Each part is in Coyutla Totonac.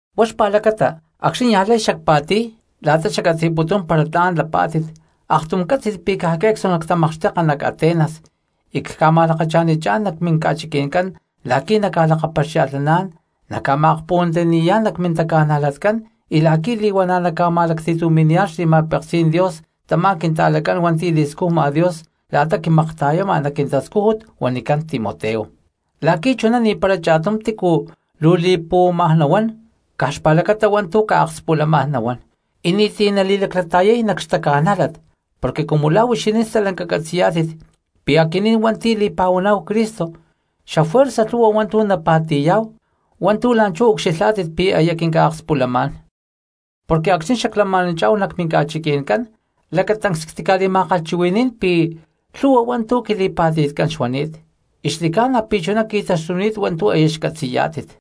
Huá xpa̠lacata acxni̠ niaj lay xacpa̠ti̠y la̠ta xaccatzi̠putún para tla̠n lapá̠tit aktum ccátzi̠lh pi̠ caj que̠cstu nactamakxteka nac Atenas y cca̠ma̠lakacha̠nichá̠n nac minca̠chiqui̠ncán la̠qui̠ naca̠lakapaxia̠lhnaná̠n naca̠ma̠akpuhuantiyani̠yá̠n nac mintaca̠najlatcán y la̠qui̠ li̠huana̠ naca̠ma̠lacti̠tumi̠niyá̠n xli̠ma̠peksí̠n Dios tamá quinta̠lacán hua̠nti̠ li̠scujma Dios la̠ta quimakta̠yama nac quintascújut huanicán Timoteo, la̠qui̠ chuná ni̠para cha̠tum tícu luu li̠puhuama nahuán caj xpa̠lacata hua̠ntu̠ ca̠akspulamá̠n nahuán y ni̠ti̠ nali̠laclata̠yay nac xtaca̠nájlat. Porque cumu la̠ huixinín stalanca catzi̠yá̠tit pi̠ aquinín hua̠nti̠ li̠pa̠huaná̠hu Cristo xafuerza lhu̠hua hua̠ntu̠ napa̠ti̠yá̠hu hua̠ntu̠ la̠nchú ucxilhá̠tit pi̠ aya quinca̠akspulamá̠n. Porque acxni̠ xaclama̠nanchá̠hu nac minca̠chiqui̠ncán lacatancs ctica̠li̠ma̠kalhchuhui̠ní̠n pi̠ lhu̠hua hua̠ntu̠ quili̠pa̠ti̠tcán xuani̠t, y xli̠ca̠na pi̠ chuná qui̠taxtuni̠t hua̠ntu̠ aya xcatzi̠yá̠tit.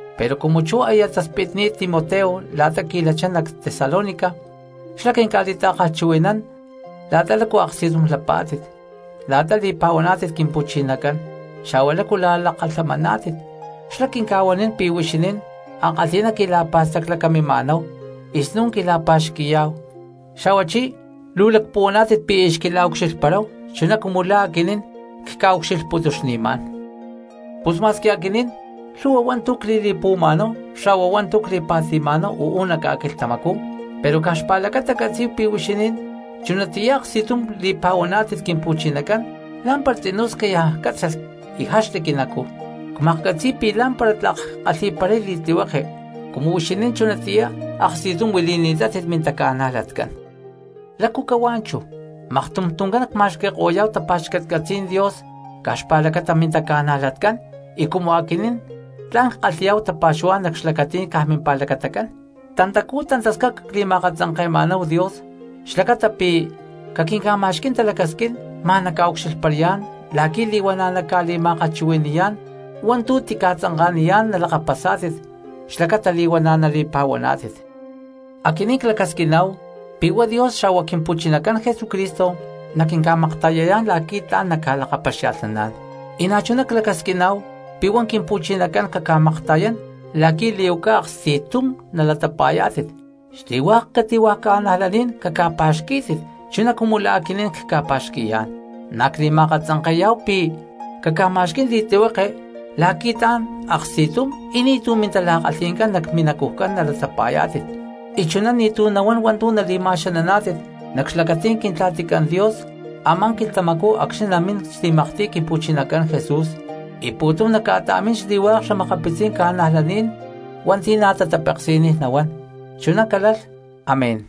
Pero cumu chú aya taspitni̠t Timoteo la̠ta qui̠lachá nac Tesalónica xlá quinca̠li̠ta̠kalhchuhui̠nán la̠ta lácu aksti̠tum lapá̠tit, la̠ta li̠pa̠huaná̠tit Quimpu̠chinacán, xa̠hua lácu lakalhamani̠naná̠tit. Xlá quinca̠huanín pi̠ huixinín ankalhi̠ná quila̠pa̠staclacaminá̠hu y snún quila̠pa̠xqui̠yá̠hu xa̠huachí luu lacpuhuaná̠tit pi̠ aya xquila̠ucxilhparáhu chuná cumu la̠ aquinín cca̠ucxilhputuxni̠má̠n. Pus ma̠squi aquinín lhu̠hua hua̠ntu̠ cli̠li̠puhuama̠náhu xa̠hua hua̠ntu̠ cpa̠ti̠ma̠náhu uú nac ca̠quilhtamacú pero caj xpa̠lacata ccatzí̠hu pi̠ huixinín chunatiyá aksti̠tum li̠pa̠huaná̠tit Quimpu̠chinacán, lá̠mpara tzinú scayaj cátzalh y jaxli quinacú. Cmaklhcatzi̠y pi̠ lá̠mpara tlak ckalhi̠paray li̠tlihueke cumu huixinín chunatiyá aksti̠tum huili̠ni̠tátit mintaca̠najlatcán. ¿Lácu cahuá chú maktum tuncán nacma̠xqui̠ko̠yá̠hu tapa̠xcatcatzí̠n Dios caj xpa̠lacata mintaca̠najlatcán y cumu aquinín tla̠n ckalhi̠yá̠hu tapa̠xuhuá̠n nac xlacatí̠n caj mimpa̠lacatacán? Tantacú tantascaca cli̠ma̠akatzanke̠ma̠náhu Dios xlacata pi̠ caquinca̠ma̠xquí̠n talacasquín ma̠n cacca̠ucxilhparán la̠qui̠ li̠huana̠ nacca̠li̠ma̠kalhchuhui̠ni̠yá̠n hua̠ntu̠ tica̠tzanka̠niyá̠n nalakapasá̠tit xlacata li̠huana̠ nali̠pa̠huaná̠tit. Aquinín clacasquiná̠hu pi̠ huá Dios xa̠hua Quimpu̠chinacán Jesucristo naquinca̠makta̠yayá̠n la̠qui̠ tla̠n nacca̠lakapaxia̠lhnaná̠n. Y na̠chuná clacasquiná̠hu pi̠ huá Quimpu̠chinacán caca̠makta̠yán la̠qui̠ li̠huaca aksti̠tum nala̠pa̠xqui̠yá̠tit, xli̠hua̠k cati̠hua̠ cristianos caca̠pa̠xquí̠tit chuná cumu la̠ aquinín cca̠pa̠xqui̠yá̠n. Na̠ cli̠ma̠akatzanke̠yá̠hu pi̠ caca̠ma̠xquí̠n li̠tlihueke la̠qui̠ tla̠n aksti̠tum y ni̠tu̠ mintala̠kalhi̠ncán nac minacujcán nalatapa̠yá̠tit y chuná ni̠tu̠ nahuán hua̠ntu̠ nali̠ma̠xananá̠tit nac xlacatí̠n Quintla̠ticán Dios a̠má quilhtamacú acxni̠ namín xli̠maktiy Quimpu̠chinacán Jesús y pu̠tum naca̠ta̠mín xli̠hua̠k xa̠makapitzí̠n cristianos hua̠nti̠ na̠ tatapeksi̠niy nahuán. Chuná calalh, amén.